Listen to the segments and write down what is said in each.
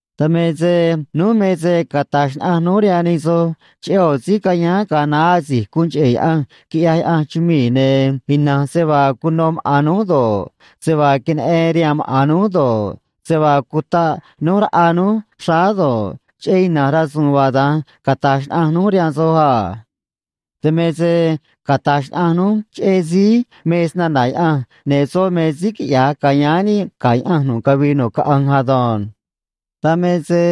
Dan me se núj me se cata̱j xnaꞌanj núj rihaan nij soj cheꞌé ꞌo̱ síí cayáán ga̱a naá asi̱j guun cheꞌe̱ Yaꞌanj quiꞌyaj Yaꞌanj chumii̱, ne̱ ina̱nj se vaa cuno maꞌa̱n núj do̱ꞌ, se vaa queneꞌen rihaan maꞌa̱n núj do̱ꞌ, se vaa cutaꞌ núj raꞌa núj xráá do̱ꞌ, cheꞌé ina̱nj rasu̱u̱n vaa da̱nj cata̱j xnaꞌanj núj rihaan soj a. Dan me se cata̱j xnaꞌanj núj cheꞌé síí me Snana̱ Yaꞌanj, ne̱ soꞌ me síí quiꞌya̱j ca̱yáán níꞌ ga̱ Yaꞌanj nu̱ꞌ cavii nu̱ꞌ caꞌanj ado̱nj. Dan me se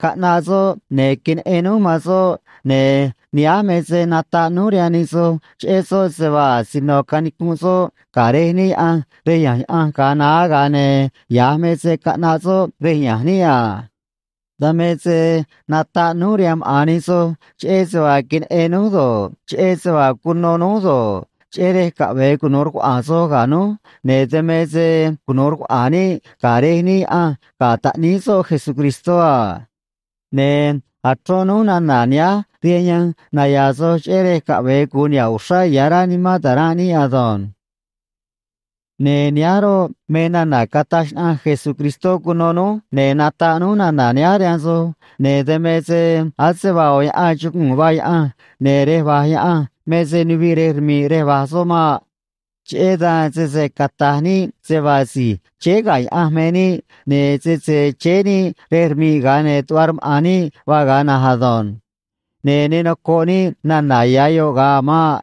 caꞌnaꞌ soꞌ, ne̱ queneꞌen núj man soꞌ, ne̱ nihánj me se nataꞌ núj rihaan nij soj cheꞌé soꞌ se vaa asino canicunꞌ soꞌ ga̱ Rej níꞌ Yaꞌanj rej ya̱nj Yaꞌanj ga̱a naá, ga̱a ne̱ ya̱j me se caꞌnaꞌ soꞌ rej ya̱nj níꞌ a. Dan me se nataꞌ núj rihaan maꞌa̱n nij soj cheꞌé se vaa queneꞌen núj do̱ꞌ, cheꞌé se vaa cuno núj do̱ꞌ, cheꞌé rej caꞌve̱e cunu̱u rcuaꞌa̱a̱n soj ga̱ núj, ne̱ dan me se cunu̱u rcuaꞌa̱a̱n níꞌ ga̱ Rej níꞌ Yaꞌanj ga̱ Taꞌníí soꞌ Jesucristó a. Ne̱ achrón núj nana̱ nihánj rihaan yanj naya̱a̱ soj, cheꞌé rej caꞌve̱e gu̱un niha̱ꞌ uxrá ya̱ rá nimán ta̱ranꞌ níꞌ ado̱nj. Ne̱ nihánj roꞌ, me nana̱ cataj xnaꞌanj Jesucristó cuno núj, ne̱ nataꞌ núj nana̱ nihánj rihaan soj, ne̱ dan me se ase vaa ꞌo̱ yaꞌan chuguu̱n vaa Yaꞌanj, ne̱ rej va̱j Yaꞌanj me se nuviꞌ rej rmi̱ꞌ rej va̱j soꞌ maꞌ. Cheꞌé dan sese cata̱j níꞌ se vaa si̱j chéé ga̱ Yaꞌanj me níꞌ, ne̱ sese chéé níꞌ rej rmi̱ꞌ, ga̱a ne̱ tuꞌva rmaꞌa̱n níꞌ vaa ga̱a na̱nj ado̱nj. Ne̱ ne nocoꞌ níꞌ nana̱ ya̱ yoꞌ ga̱a a̱ maꞌ.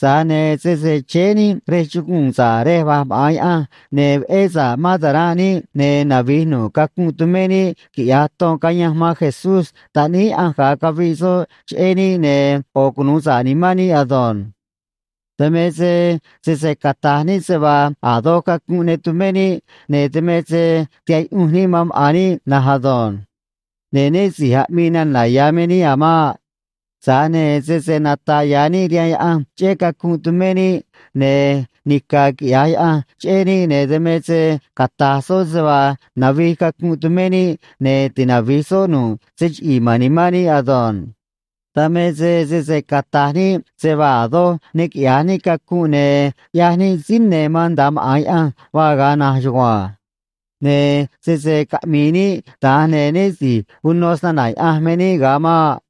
Tza̱j ne̱ sese chéé níꞌ rej chuguu̱n sa̱ꞌ rej va̱j maꞌa̱n Yaꞌanj, ne̱ veꞌé sa̱ꞌ mán ta̱ranꞌ níꞌ, ne̱ navi̱j nu̱ꞌ cacunꞌ tumé níꞌ, quiꞌya̱j ton cayanj man Jesús Taꞌníí Yaꞌanj ga̱a caviꞌ soꞌ cheꞌé níꞌ, ne̱ ꞌo̱ cunu̱u sa̱ꞌ nimán níꞌ ado̱nj. Dan me se sese cata̱j níꞌ se vaa a̱ doj cacunꞌ ne tumé níꞌ, ne̱ dan me se tihaꞌ yuꞌunj níꞌ man maꞌa̱n níꞌ na̱nj ado̱nj. Ne̱ né si̱j aꞌmii nana̱ ya̱ me níꞌ a̱ maꞌ. Tza̱j ne̱ sese nata̱ꞌ ya̱ níꞌ rihaan Yaꞌanj cheꞌé cacunꞌ tumé níꞌ, ne̱ nica̱ quiꞌya̱j Yaꞌanj cheꞌé níꞌ, ne̱ dan me se cata̱j soꞌ se vaa navij cacunꞌ tumé níꞌ, ne̱ tinavi̱j soꞌ nu̱ꞌ se chiꞌi̱i̱ ma̱n nimán níꞌ ado̱nj. Dan me se sese cata̱j níꞌ se vaa a̱ doj ne quiꞌya̱j níꞌ cacunꞌ, ne̱ ꞌyaj níꞌ síí ne̱ man nda̱a maꞌa̱n Yaꞌanj vaa ga̱a na̱nj chugua̱nj. Ne̱ sese caꞌmi̱i̱ níꞌ da̱nj, ne̱ né si̱j uno snana̱ Yaꞌanj me níꞌ ga̱a maꞌ.